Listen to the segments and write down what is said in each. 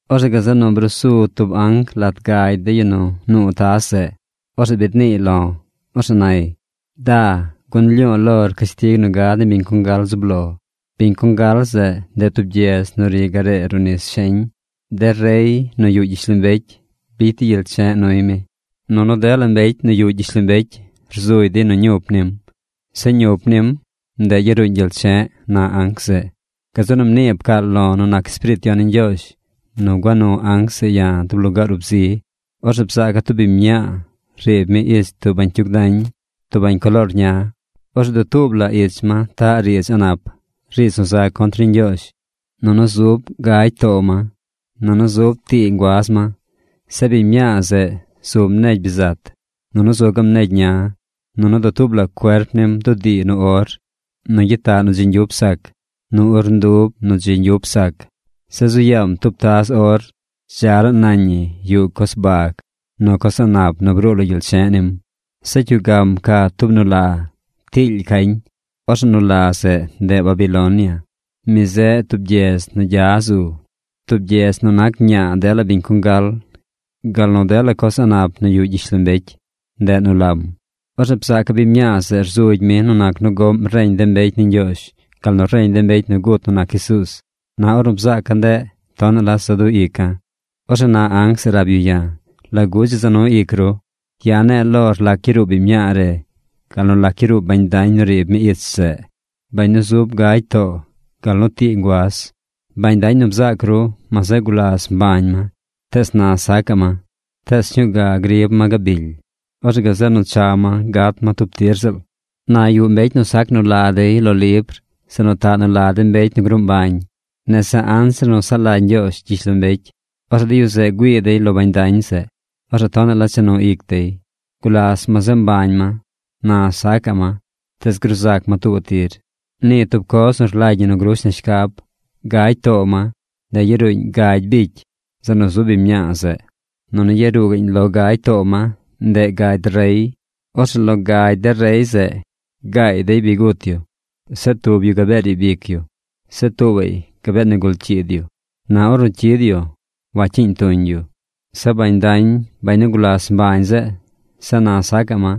Orzeꞌ gazeꞌ nu brusu tub anc lat gagy de yu nu nuu taz zeꞌ. Orzeꞌ biid niiy lo̱. Orzeꞌ nay: ―Da, gun lyu̱u̱ lor cashtig nu gad ni biñ congal zub lo. Biñ congal zeꞌ, ndeꞌ tub gyedz nu ri garee ruꞌ nis sheñ. De rey nu yuꞌ gyishlombecy bicy dey gyel che̱ꞌ nuy mi. Nunu dela mbecy nu yuꞌ gyishlombecy rzugy dey nu ñup nim. Zeꞌ ñup nim, ndeꞌ yaruuñ gyel che̱ꞌ ―na anc zeꞌ. Gazeꞌ nu mnii pcaal lo̱ nu nac Espiriit Yon ni Ñgyoozh nu gua nu anc zeꞌ ya̱ tub lugaar ub zi. Orzeꞌ bzaaca̱ tub biñ mñaa riib mi ich tub bañcyug dañ, tub bañ coloor ña. Orzeꞌ dutuub la ich ma taꞌ riidz a̱ꞌ nap, riidz nu za contr ni Ñgyoozh. Nunu zub gagy too ma. Nunu zub tii nguaz ma. Zeꞌ biñ mñaa zeꞌ zum negy bizat. Nunu zu gaꞌm negy ña. Nunu dutuub la cuerp nim bdudii nu or, nu gyitaꞌ nu dzi ñgyup sac, nu urndub nu dzi ñgyup sac. Zeꞌ zu yaam tub taz or. Dza laa nañ ñi yuꞌ coz bag nu coz a̱ꞌ nap nu bruu lo gyel che̱ꞌ nim. Zeꞌ cyugam ca tub nu la. Tiily cañ. Orzeꞌ nu la zeꞌ, ndeꞌ Babilonia. Mi zeꞌ tub gyedz nu gya zu, tub gyedz nu nac ñaa dela biñ congal gal nu dela coz a̱ꞌ nap nu yuꞌ gyishlombecy. Ndeꞌ nu lam. Orzeꞌ bzaaca̱ biñ mñaa zeꞌ rzugy mi nu nac nu goꞌm reñ de mbecy ni Ñgyoozh, gal nu reñ de mbecy nu gut nu nac Jesuuz. Na ornu bzaaca̱ ndeꞌ, tonaꞌ la za du ica̱. Orzeꞌ na anc zeꞌ rab yu ya̱: ―¿Lagu dzi za nu ic ru? Ya̱ ne̱e̱ lor lac yaruu biñ mñaa re gal nu lac yaruu bañ dañ nu riib mi ich zeꞌ, bañ nu zub gagy too gal nu tii nguaz. Bañ dañ nu bzaac ru, ma zeꞌ gulas mbañ ma, tees na sacaꞌ ma. Tees sñuu ga grib ma gabily. Orzeꞌ gazeꞌ nu cha ma gat ma tub tir ziꞌl. Na yuꞌ mbecy nu sac nu la dey lo libr, zeꞌ nu taꞌ nu la de mbecy nu gruu mbañ nese anzir nu saꞌ lagy Ñgyoozh gyishlombecy. Orzeꞌ de yu zeꞌ güii dey lo bañ dañ zeꞌ. Orzeꞌ tonaꞌ la cha nu ic dey. Gulas ma zeꞌ mbañ ma. Na sacaꞌ ma. Tees gruu zac ma tuubaꞌ tir. ’Nii tub coz nu rlagy ñi nu grush na shcab. Gagy too ma, ndeꞌ yaruuñ gagy bicy, zeꞌ nu zub biñ mñaa zeꞌ. Nunu yaruu gaꞌñ lo gagy too ma, ndeꞌ gagy rey. Orzeꞌ lo gagy de rey zeꞌ, gaay dey bi gut yu. Zeꞌ tub yu gabee riib ic yu. Zeꞌ tuubaꞌy gabee nigul cyiid yu. Na ornu cyid yu, wacyiiñ yu tuñ. Zeꞌ bañ dañ, bañ nu gulas mbañ zeꞌ, zeꞌ na sacaꞌ ma,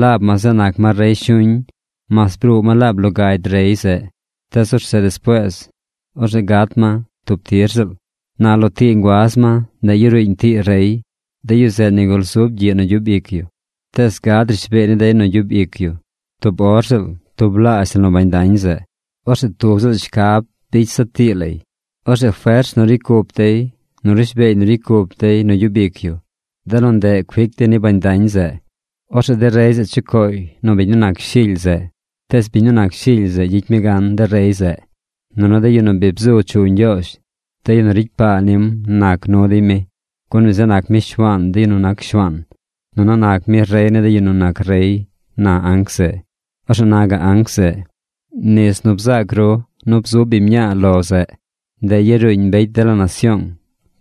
laab ma zeꞌ nac ma rey shuñ mas bruu ma laab lo gagy rey zeꞌ. Tees orzeꞌ despuees, orzeꞌ gat ma tub tir ziꞌl. ’Na lo tii nguaz ma, ndeꞌ yaruuñ tii rey. De yu zeꞌ nigul zub gyiꞌ nu gyub ic yu. Tees gad rishbeey ni dey nu gyub ic yu tub or ziꞌl tublaazh la nu bañ dañ zeꞌ. Orzeꞌ tub ziꞌl shcab bicy dey zaꞌ tii lay. Orzeꞌ fers nu ricy cup dey, nu rishbeey nu ricy cup dey nu gyub ic yu, de nu ndeꞌ cuic dey ni bañ dañ zeꞌ. Orzeꞌ de rey zeꞌ chucooy nu biñ nu nac Shily zeꞌ. Tees biñ nu nac Shily zeꞌ gyicy mi gan de rey zeꞌ. Nunu de yu nu bi bzu chu Ñgyoozh, de yu nu ricy paa nim nac nu dey mi. Gun mi zeꞌ nac mi Shuaan de yu nu nac shuaan, nunu nac mi rey ni de yu nu nac rey ―na anc zeꞌ. Orzeꞌ na gaꞌ anc zeꞌ: ―Nis nu bzaac ru zeꞌ nu bzu biñ mñaa lo zeꞌ, ndeꞌ yaruuñ mbecy dela nasyoong,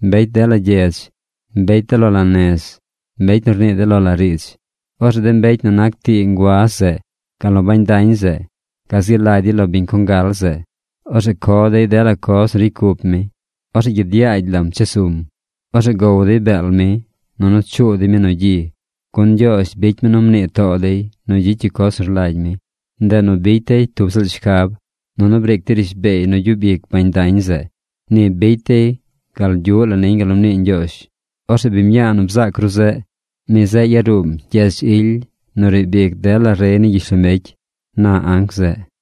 mbecy dela gyedz, mbecy de lo la nez, mbecy nu rnii de lo la riidz. Orzeꞌ de mbecy nu nac tii nguaz zeꞌ, gal nu bañ dañ zeꞌ gazi lagy dey lo biñ congal zeꞌ. Orzeꞌ co dey dela coz nu ricy cup mi. Orzeꞌ gyid yaagy lam chesum. Orzeꞌ gow dey beel mi, nunu chuu dey mi nu gyi. Gun Ñgyoozh bicy mi nu mnii too dey nu gyicy yu coz nu rlagy mi. Ndeꞌ nu bicy dey tub ziꞌl shcab, nunu briic dey rishbeey nu gyub ic bañ dañ zeꞌ. Ni bicy dey gal gyuꞌ la niñ gal nu mnii Ñgyoozh. Orzeꞌ biñ mñaa nu bzaac ru zeꞌ, mi zeꞌ yaruum gyedz ily nu riib ic dela rey ni gyishlombecy ―na anc zeꞌ.